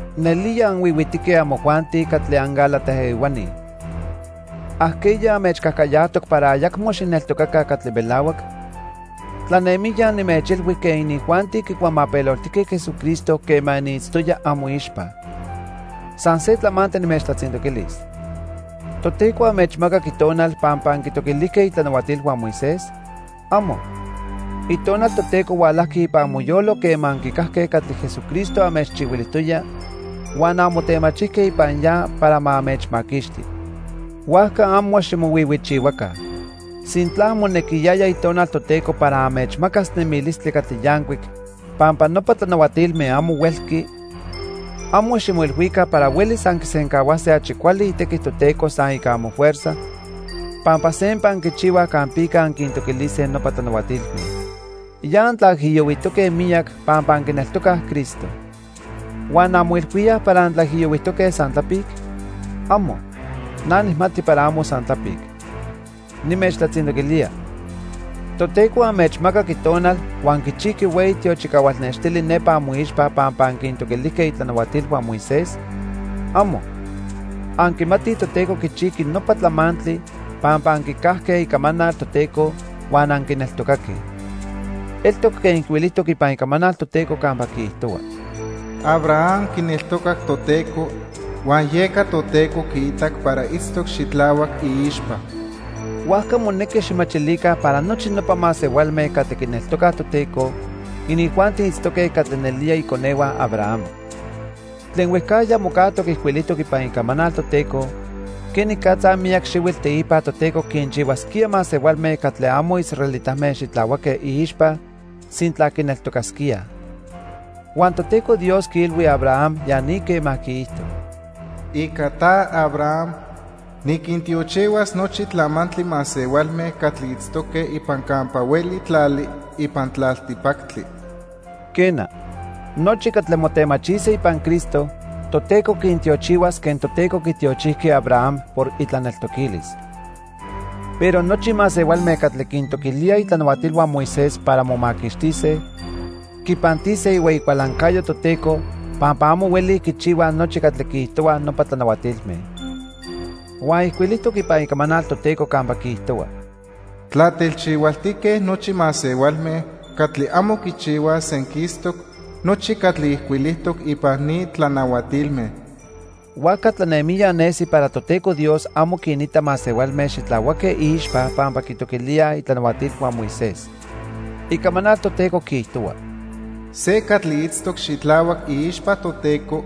¡Nelía anhuihuitique amojuanti catli anGálata ehuani! ¿Ajqueya anmechcajcayajtoc para ayacmo xijneltocaca catli melahuac? Tlanemijya nimechilhui quen inijuanti quicuamapeloltijque Jesucristo quema niitztoya amoixpa. San se tlamantli nimechtlatzintoquilis. ¿Toteco anmechmacac Itonal pampa anquintoquilijque itlanahuatilhua Moisés? ¡Amo! Itonal Toteco hualajqui ipan amoyolo quema anquicajque catli Jesucristo anmechchihuilijtoya huan anmotemachijque ipan ya para ma anmechmaquixti. Huajca amo ximohuihuichihuaca. Sintla monequiyaya Itonal Toteco para anmechmacas nemilistli catli yancuic pampa nopa tlanahuatilme amo huelqui, amo ximoilhuica para huelis anquisencahuase achi cuali itequi Toteco san ica amofuerza pampa sempa anquichihuaj campica anquintoquilise nopa tlanahuatilme. Ya antlaijiyohuijtoque miyac pampa anquineltocaj Cristo. ¿Huan anmoilhuíaj para antlaijiyohuijtoque san tlapic? ¡Amo! Na nijmati para amo san tlapic. Nimechtlatzintoquilía: ¿Toteco anmechmacac Itonal huan quichijqui hueyi tiochicahual nextili nepa amoixpa pampa anquintoquilijque itlanahuatilhua Moisés? ¡Amo! Anquimatij Toteco quichijqui nopa tlamantli pampa anquicajque icamanal Toteco huan anquineltocaque. Eltoc quen ijcuilijtoc ipan Icamanal Toteco campa quiijtohua: "Abraham quineltocac Toteco, huan yeca Toteco quiitac para itztoc xitlahuac iixpa." Huajca monequi xijmachilica para nochi nopa masehualme catli quineltocaj Toteco, inijuanti itztoque catli nelía iconehua Abraham. Tlen huejcajya mocajtoc ijcuilijtoc ipan Icamanal Toteco quenicatza miyac xihuitl teipa Toteco quinchihuasquía masehualme catli amo israelitame xitlahuaque iixpa sintla quineltocasquíaj. Huan Toteco Dios quiilhui Abraham ya ni quema quiijto: "Ica ta, Abraham, niquintiochihuas nochi tlamantli masehualme catli itztoque ipan campa hueli tlali ipan tlaltipactli." Quena, nochi catli motemachise ipan Cristo, Toteco quintiochihuas quen Toteco quitiochijqui Abraham por itlaneltoquilis. Pero nochi masehualme catli quintoquilíaj itlanahuatilhua Moisés para momaquixtise, quipantise ihueyi cualancayo Toteco pampa amo huelij quichihuaj nochi catli quiijtohuaj nopa tlanahuatilme. Huan ijcuilijtoc ipan Icamanal Toteco campa quiijtohua: "Tlatelchihualtique nochi masehualme catli amo quichihuaj senquistoc nochi catli ijcuilijtoc ipan ni tlanahuatilme." Huajca tlanemijya nesi para Toteco Dios amo quinita masehualme xitlahuaque iixpa pampa quitoquilíaj itlanahuatilhua Moisés. Icamanal Toteco quiijtohua: "Se catli itztoc xitlahuac iixpa Toteco,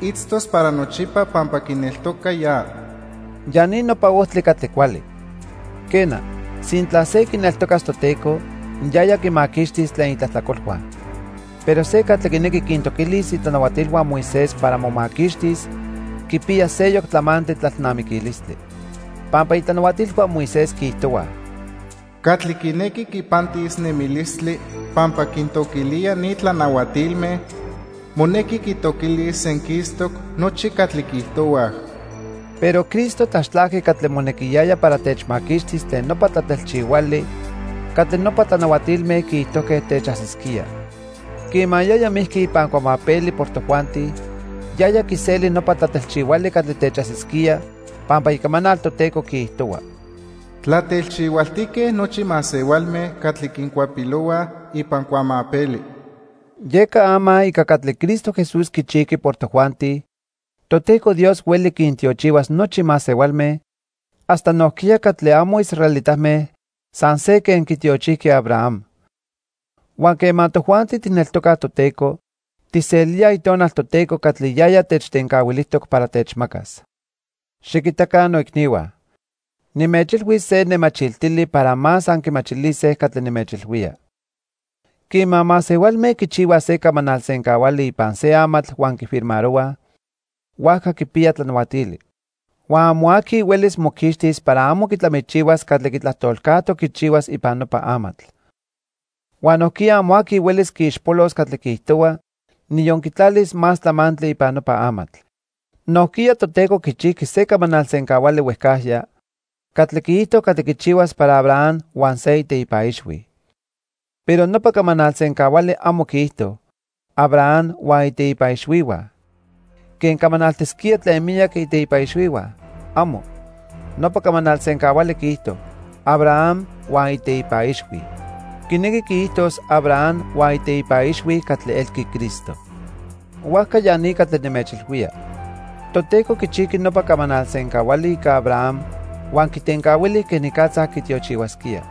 itztos para nochipa pampa quineltoca ya." Ya ni nopa ojtli catli cuali. Quena, sintla se quineltocas Toteco, yaya quimaquixtis tlen itlajtlacolhua. Pero se catli quinequi quintoquilis itlanahuatilhua Moisés para momaquixtis quipiya seyoc tlamantli tlalnamiquilistli. Pampa itlanahuatilhua Moisés quiijtohuaj: "Catli quinequi quipantis nemilistli pampa quintoquilía ni tlanahuatilme, monequi quitoquilis senquistoc nochi catli quiijtohuaj." Pero Cristo tlaxtlajqui catli monequiyaya para techmaquixtis tlen nopa tlatelchihuali catli nopa tlanahuatilme quiijtojque techajsisquía. Quema yaya mijqui ipan cuamapeli por tojuanti, yaya quiseli nopa tlatelchihuali catli techajsisquía, pampa Icamanal Toteco quiijtohua: "Tlatelchihualtique nochi masehualme catli quincuapilohuaj ipan cuamapeli." Yeca ama ica catli Cristo Jesús quichijqui por tojuanti, Toteco Dios hueli quintiochihuas nochi masehualme, hasta nojquiya catli amo israelitame san se quen quitiochijqui Abraham. Huan quema tojuanti tijneltocaj Toteco, tijselíaj Itonal Toteco catli yaya techtencahuilijtoc para techmacas. Xiquitaca noicnihua. Nimechilhuis se nemachiltili para más anquimachilise catli nimechilhuía. Quema masehualme quichihuaj se camanal sencahuali ipan se amatl huan quifirmarohuaj, huajca quipiya tlanahuatili. Huan amo aqui huelis moquixtis para amo quitlamichihuas catli quitlajtolcajtoc quichihuas ipan nopa amatl. Huan nojquiya amo aqui huelis quiixpolos catli quiijtohua, niyon quitlalis más tlamantli ipan nopa amatl. Nojquiya Toteco quichijqui se camanal sencahuali huejcajya catli quiijto catli quichihuas para Abraham huan se iteipa ixhui. Pero nopa camanal sencahuali amo quiijto: "Abraham huan iteipa ixhuihua", quen camanaltisquía tlen miyac iteipa ixhuihua. ¡Amo! Nopa camanal sencahuali quiijto: "Abraham huan iteipa ixhui." Quinequi quiijtos Abraham huan iteipa ixhui catli elqui Cristo. Huajca ya ni catli nimechilhuía: Toteco quichijqui nopa camanal sencahuali ica Abraham huan quitencahuili quenicatza quitiochihuasquía.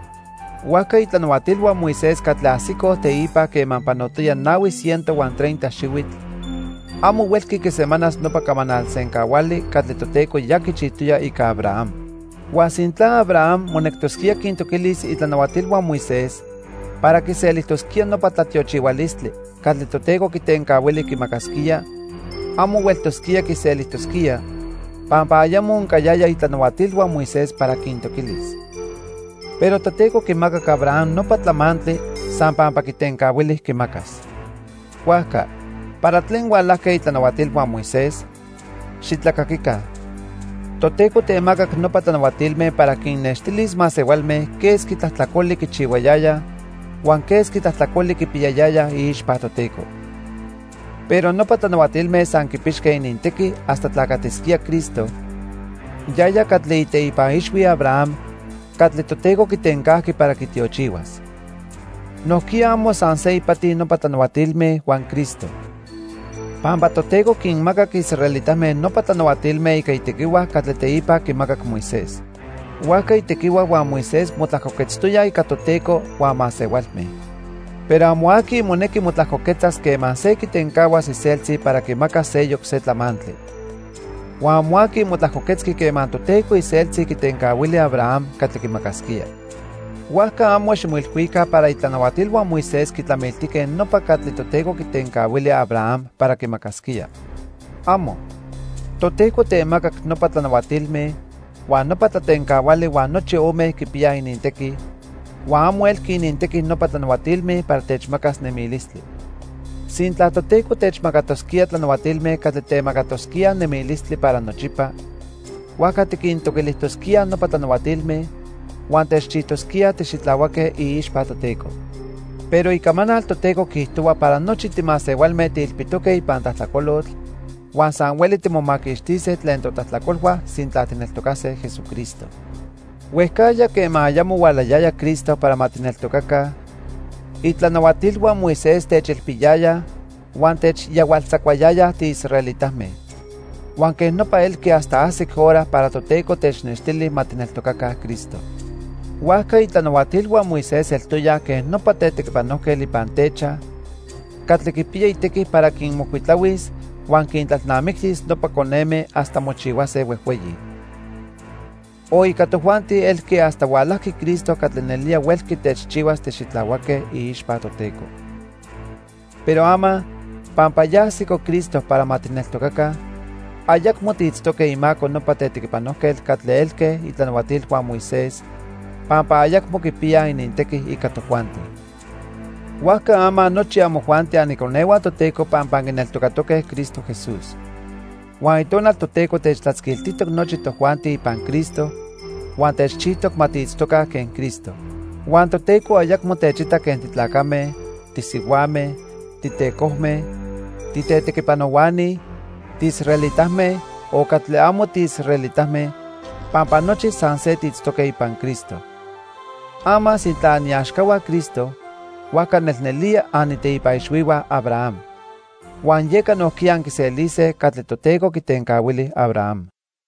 Huajca itlanahuatilhua Moisés catli ajsicoj teipa quema panotoya nahui ciento huan treinta xihuitl, amo huelqui quisemanas nopa camanal sencahuali catli Toteco ya quichijtoya ica Abraham. Huan sintla Abraham monectosquía quintoquilis itlanahuatilhua Moisés para quiselijtosquía nopa tlatiochihualistli catli Toteco quitencahuili quimacasquía, amo hueltosquía quiselijtosquía, pampa ayamo oncayayaj itlanahuatilhua Moisés para quintoquilis. Pero Toteco quimacac Abraham nopa tlamantli san pampa quitencahuili quimacas. Huajca, ¿para tlen hualajque itlanahuatilhua Moisés? ¡Xitlacaquica! Toteco temacac nopa tlanahuatilme para quinnextilis masehualme quesqui tlajtlacoli quichihuayayaj huan quesqui tlajtlacoli quipiyayayaj iixpa Toteco. Pero nopa tlanahuatilme san quipixque inintequi hasta tlacatisquía Cristo, yaya catli iteipa ixhui Abraham catli Toteco quitencajqui para quitiochihuas. Nojquiya amo san se ipati nopa tlanahuatilme huan Cristo. Pampa Toteco quinmacac israelitame nopa tlanahuatilme ica itequihua catli teipa quimacac Moisés. Huajca itequihua huan Moisés motlajcoquetztoyaj ica Toteco huan masehualme. Pero amo aqui monequi motlajcoquetzas quema se quitencahuas iseltzi para quimacas seyoc se tlamantli. Huan amo aqui motlajcoquetzqui quema Toteco iseltzi quitencahuili Abraham catli quimacasquía. Huajca amo ximoilhuica para itlanahuatilhua Moisés quitlamiltijque nopa catli Toteco quitencahuili Abraham para quimacasquía. ¡Amo! Toteco temacac nopa tlanahuatilme huan nopa tlatencahuali huan nochi ome quipiyaj inintequi, huan amo elqui inintequi nopa tlanahuatilme para techmacas nemilistli. Sintla Toteco techmacatosquía tlanahuatilme catli temacatosquíaj nemilistli para nochipa, huajca tiquintoquilijtosquíaj nopa tlanahuatilme, huan techchijtosquía tixitlahuaque iixpa Toteco. Pero Icamanal Toteco quiijtohua para nochi timasehualme tiilpitoque ipan tlajtlacolotl, huan san hueli timomaquixtise tlen totlajtlacolhua sintla tijneltocase Jesucristo. Huejcajya quema ayamo hualayaya Cristo para ma tijneltocaca, itlanahuatilhua Moisés techilpiyayaj huan techyahualtzacuayaya tiisraelitame. Huan quej nopa elqui hasta ajsic hora para Toteco technextili ma tijneltocaca Cristo. Huajca itlanahuatilhua Moisés eltoyaj quen nopa tetequipanojquetl ipan techaj catli quipiya itequi para quinmocuitlahuis huan quintlalnamictis nopa coneme hasta mochihuase huejhueyi. O ica tojuanti elqui hasta hualajqui Cristo catli nelía huelqui techchihuas tixitlahuaque iixpa Toteco. Pero ama, pampa ya ajsico Cristo para ma tijneltocaca, ayacmo tiitztoque imaco nopa tetequipanojquetl catli elque itlanahuatilhua Moisés, pampa ayacmo quipiyaj inintequi ica tojuanti. Huajca ama nochi amojuanti aniconehua Toteco pampa anquineltocatoque Cristo Jesús. Huan Itonal Toteco techtlatzquiltijtoc nochi tojuanti ipan Cristo, huan techchijtoc ma tiitztoca quen Cristo. Huan Toteco ayacmo techita quen titlacame, tisihuame, titecojme, titetequipanohuani, tiisraelitame, o catli amo tiisraelitame, pampa nochi san se tiitztoque ipan Cristo. Ama sintla aniaxcahua Cristo, huajca nelnelía aniteipa ixhuihua Abraham. Huan yeca nojquiya anquiselise catli Toteco quitencahuili Abraham.